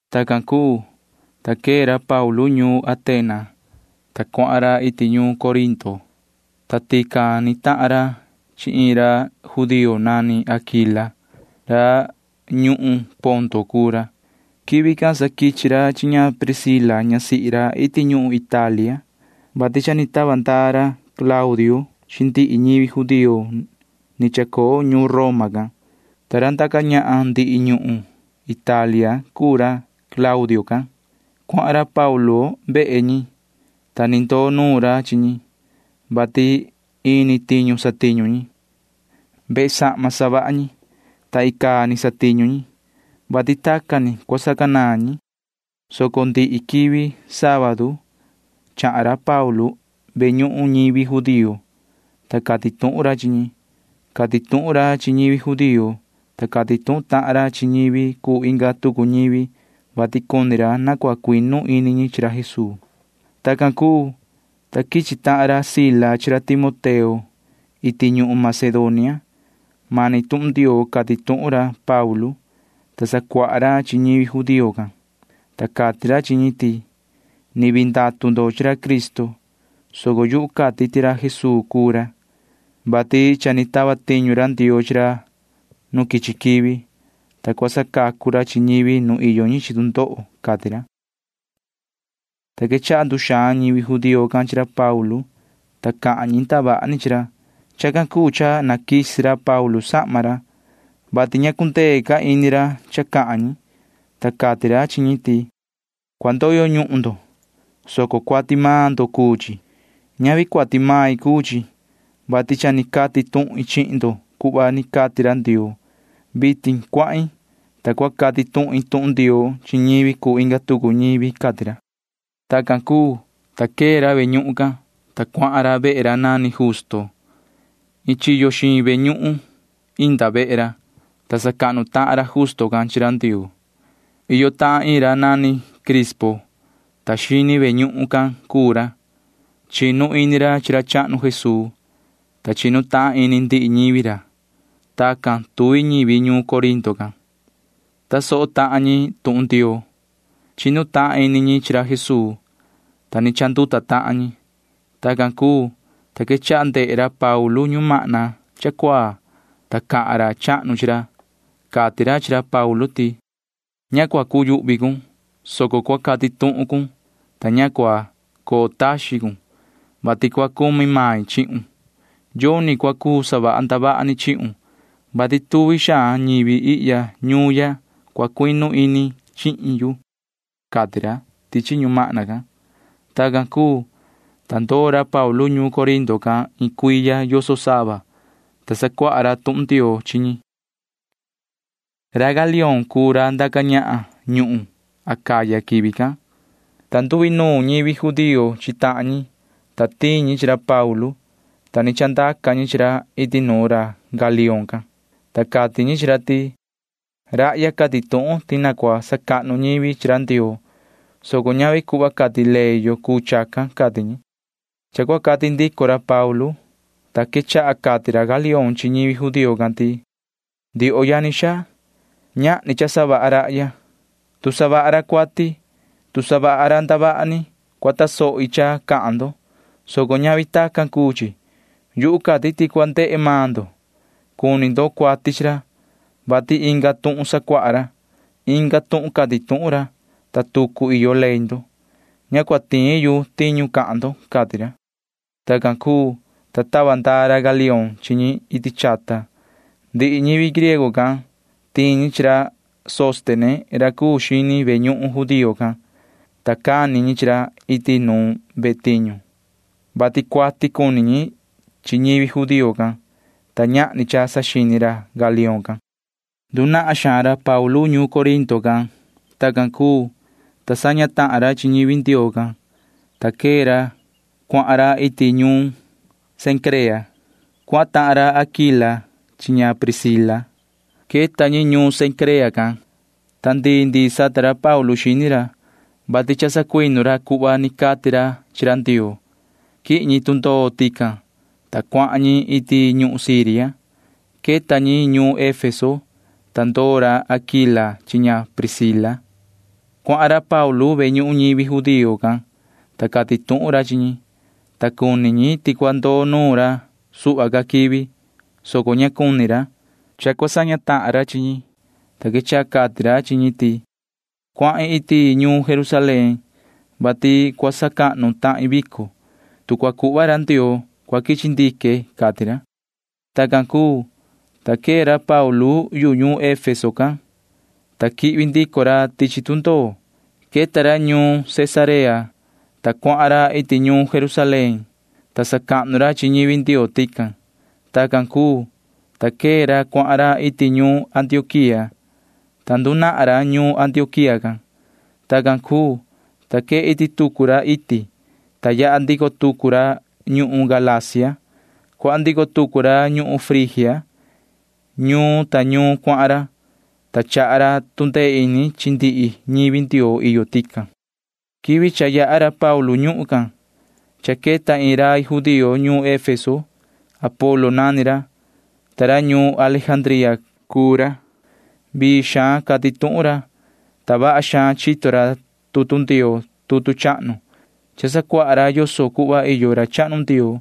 Tacan cuu, ta quee ra Paulu ñuun Atena, ta cuahan ra iti ñuun Corinto, ta tican ni tahan ra chi iin ra judío nani Aquila. Ra ñuhun Ponto cuu ra. Quivi can sa quichi ra chi Pricila ñasihi ra iti ñuhun Italia, vati cha ni tava ndaa ra Claudio chi ndihi ñivi judío ni chacoo ñuun Roma can, ta ra ndaca ñahan ndihi ñuhun Italia cuu ra Claudio can. Cuahan ra Paulu vehe ñi, ta ni ndoo nuun ra chi ñi, vati ini tiñu satiñu ñi. Vehe sahma savaha ñi, ta icaa ni satiñu ñi, vati tacan ni cua sacanaan ñi, soco ndihi quivi sábadu chahan ra Paulu ve ñuhun ñivi judío, ta cati tuhun ra chi ñi. Cati tuhun ra chi ñivi judío, ta cati tuhun tahan ra chi ñivi cuu inga tucu ñivi, vati cuni ra na cua cuinu ini ñi chi ra Jesuu. Tacan cuu, ta quichi tahan ra Sila chi ra Timoteo iti ñuhun Macedonia. Mani tuhun Ndioo cati tuhun ra Paulu, ta sacuaha ra chi ñivi judío can, ta cati ra chi ñi ti: ―Ni vii ndatu ndo chi ra Cristo, soco yu cati ti ra Jesuu cuu ra, [vati cha ni tava tiñu ra Ndioo chi ra nu quichi quivi, ta cua sacacu ra chi ñivi nu iyo ñi chi tu ndoho] ―cati ra. Ta quechaha nduxaan ñivi judío can chi ra Paulu, ta cahan ñi ndavaha ni chi ra. Chacan cuu cha naquisi ra Paulu sahma ra, [vati ña cundee ca ini ra cha cahan ñi,] ta cati ra chi ñi ti: ―Cua ndoyo ñuhun ndo, soco cuati maan ndo cuu chi. Ñavi cuati main cuu chi, vati cha ni cati tuhin chihin ndo cuhva ni cati ra Ndioo. Vitin cuahin, ta cua cati tuhin tuhun Ndioo chi ñivi cuu inga tucu ñivi ―cati ra. Tacan cuu, ta quee ra ve ñuhun can, ta cuahan ra vehe ra nani Justo. Iin chiyo xiin ve ñuhun inda vehe ra, ta sacahnu tahan ra Justo can chi ra Ndioo. Iyo tahan iin ra nani Crispo, ta xini ve ñuhun can cuu ra. Chinu ini ra chi ra chahnu Jesuu, ta chinu tahan ini ndihi ñivi ra. Tacan tuvi ñivi ñuun Corinto can―tasoho tahan ñi tuhun Ndioo. Chinu tahan ini ñi chi ra Jesuu, ta ni chanduta tahan ñi. Tacan cuu, ta quechaha ndehe ra Paulu ñumahna cha cuaa, ta cahan ra chahnu chi ra. Cati ra chi ra Paulu ti: ―Ña cua cuyuhvi cun, soco cua cati tuhun cun, ta ña cua coo taxin cun, vati cua cumi main chihun. Yoni cua cuu savaha ndavaha ni chihun, vati tuvi xaan ñivi ihya ñuun ya cua cuinu ini chihin yu ―cati ra tichi ñumahna can. Tacan cuu, ta ndoo ra Paulu ñuun Corinto can iin cuiya yoso sava, ta sacuaha ra tuhun Ndioo chi ñi. Ra Galión cuu ra ndaca ñahan ñuhun Acaya quivi can, ta nduinuun ñivi judío chi tahan ñi, ta tiin ñi chi ra Paulu, ta ni chandaca ñi chi ra iti nuun ra Galión can, ta cati ñi chi ra ti: ―Rahya cati tuhun ti na cua sacahnu ñivi chi ra Ndioo, soco ñavi cuhva cati ley yo cuu chacan ―cati ñi. Cha cua cati ndico ra Paulu, ta quechaha cati ra Galión chi ñivi judío can ti: ―Ndioho yani xaa, ñahni cha savaha rahya. Tu savaha ra cuati, tu savaha ra ndavaha ni, cua tasohi cha cahan ndo, soco ñavi tacan cuu chi. Yu cati ti cua ndehe maan ndo. Cuni ndo cuati chi ra, vati inga tuhun sacuaha ra. Inga tuhun cati tuhun ra, ta tucu iyo ley ndo. Ña cua tiin yu tiñu cahan ndo ―cati ra. Tacan cuu, ta tava ndaa ra Galión chi ñi iti chata. Ndihi ñivi griego can―tiin ñi chi ra Sóstene ra cuu xini ve ñuhun judío can, ta cani ñi chi ra iti nuun ve tiñu, vati cuati cuni ñi chi ñivi judío can, ta ñahni cha saxini ra Galión can. Ndunahan xaan ra Paulu ñuun Corinto can. Tacan cuu, ta saña tahan ra chi ñivi Ndioo can, ta quee ra cuahan ra iti ñuun Cencrea. Cuahan tahan ra Aquila chi ña Pricila. Queta ñi ñuun Cencrea can, ta ndii ndii sata ra Paulu xini ra, vati cha ni sacuinu ra cuhva ni cati ra chi ra Ndioo. Quihin ñi tundoo tican, ta cuahan ñi iti ñuhun Siria. Queta ñi ñuun Efeso, ta ndoo ra Aquila chi ña Pricila. Cuahan ra Paulu ve ñuhun ñivi judío can, ta cati tuhun ra chi ñi, ta cuni ñi ti cua ndoo nuun ca ra suhva ca quivi, soco ña cuni ra. Cha cua saña tahan ra chi ñi, ta quechaha cati ra chi ñi ti: ―Cuahin iti ñuun Jerusalén, vati cua sacahnu tahin vico. Tu cua cuhva ra Ndioo, cua quichi ndique ―cati ra. Tacan cuu, ta quee ra Paulu yu ñuun Efeso can, ta quihvi ndico ra tichi tundoo. Queta ra ñuun Cesarea, ta cuahan ra iti ñuun Jerusalén, ta sacahnu ra chi ñivi Ndioo tican. Tacan cuu, ta quee ra cuahan ra iti ñuun Antioquía, ta ndunahan ra ñuun Antioquía can. Tacan cuu, ta quee iti tucu ra iti, ta yaha ndico tucu ra ñuhun Galacia. Cuahan ndico tucu ra ñuhun Frigia. Ñuun ta ñuun cuahan ra, ta chaha ra tu ndee ini chi ndihi ñivi Ndioo iyo tican. Quivi cha yaha ra Paulu ñuhun can cha queta iin rai judío ñuun Efeso. Apolo nani ra, ta ra ñuun Alejandría cuu ra. Vii xaan cati tuhun ra, ta vaha xaan chito ra tutu Ndioo tutu chahnu. Cha sacuaha ra yoso cuhva iyo ra chahnu Ndioo,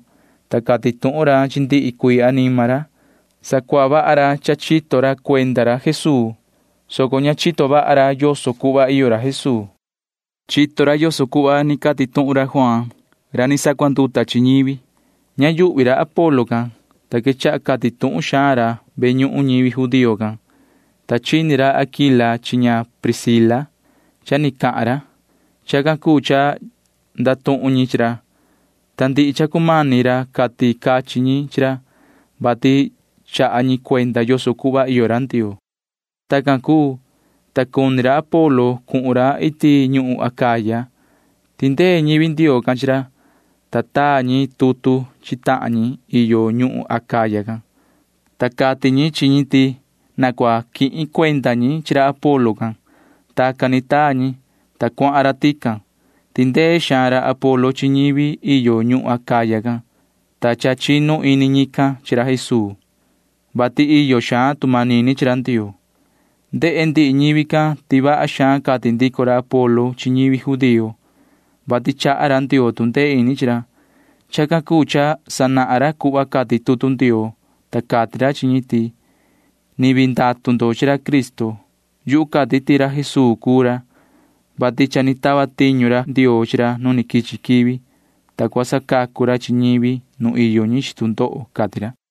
ta cati tuhun ra chi ndihi cuii anima ra. Sacuaha vaha ra cha ni chito ra cuenda ra Jesuu, soco ña chito vaha ra yoso cuhva iyo ra Jesuu. Chito ni ra yoso cuhva ni cati tuhun ra Juaan, ta sacuanduta ra chi ñivi. Ña yuhvi ra Apolo can, ta quechaha cati tuhun xaan ra ve ñuhun ñivi judío can, ta chini ra Aquila chi ña Pricila cha ni cahan ra. Chacan cuu cha ndatuhun ñi chi ra, ta ndihi cha cumani ra cati cachin ñi chi ra, vati chaha ñi cuenda yoso cuhva iyo ra Ndioo. Tacan cuu, ta cuni ra Apolo cuhun ra iti ñuhun Acaya. Tindee ñivi Ndioo can chi ra, ta taa ñi tutu chi tahan ñi iyo ñuhun Acaya can, ta cati ñi chi ñi ti na cua quihin cuenda ñi chi ra Apolo can. Tacan ni taa ñi, ta cuahan ra tican. Tindee xaan ra Apolo chi ñivi iyo ñuhun Acaya can, ta cha chinu ini ñican chi ra Jesuu, vati iyo xaan tu manini chi ra Ndioo. Ndehe ndihi ñivi can ti vaha xaan cati ndico ra Apolo chi ñivi judío, vati chaha ra Ndioo tu ndee ini chi ra. Chacan cuu cha sanahan ra cuhva cati tutu Ndioo, ta cati ra chi ñi ti: ―Ni vii ndatu ndo chi ra Cristo. Yu cati ti ra Jesuu cuu ra, [vati cha ni tava tiñu ra Ndioo chi ra nu quichi quivi, ta cua sacacu ra chi ñivi nu iyo ñi chi tu ndoho] ―cati ra.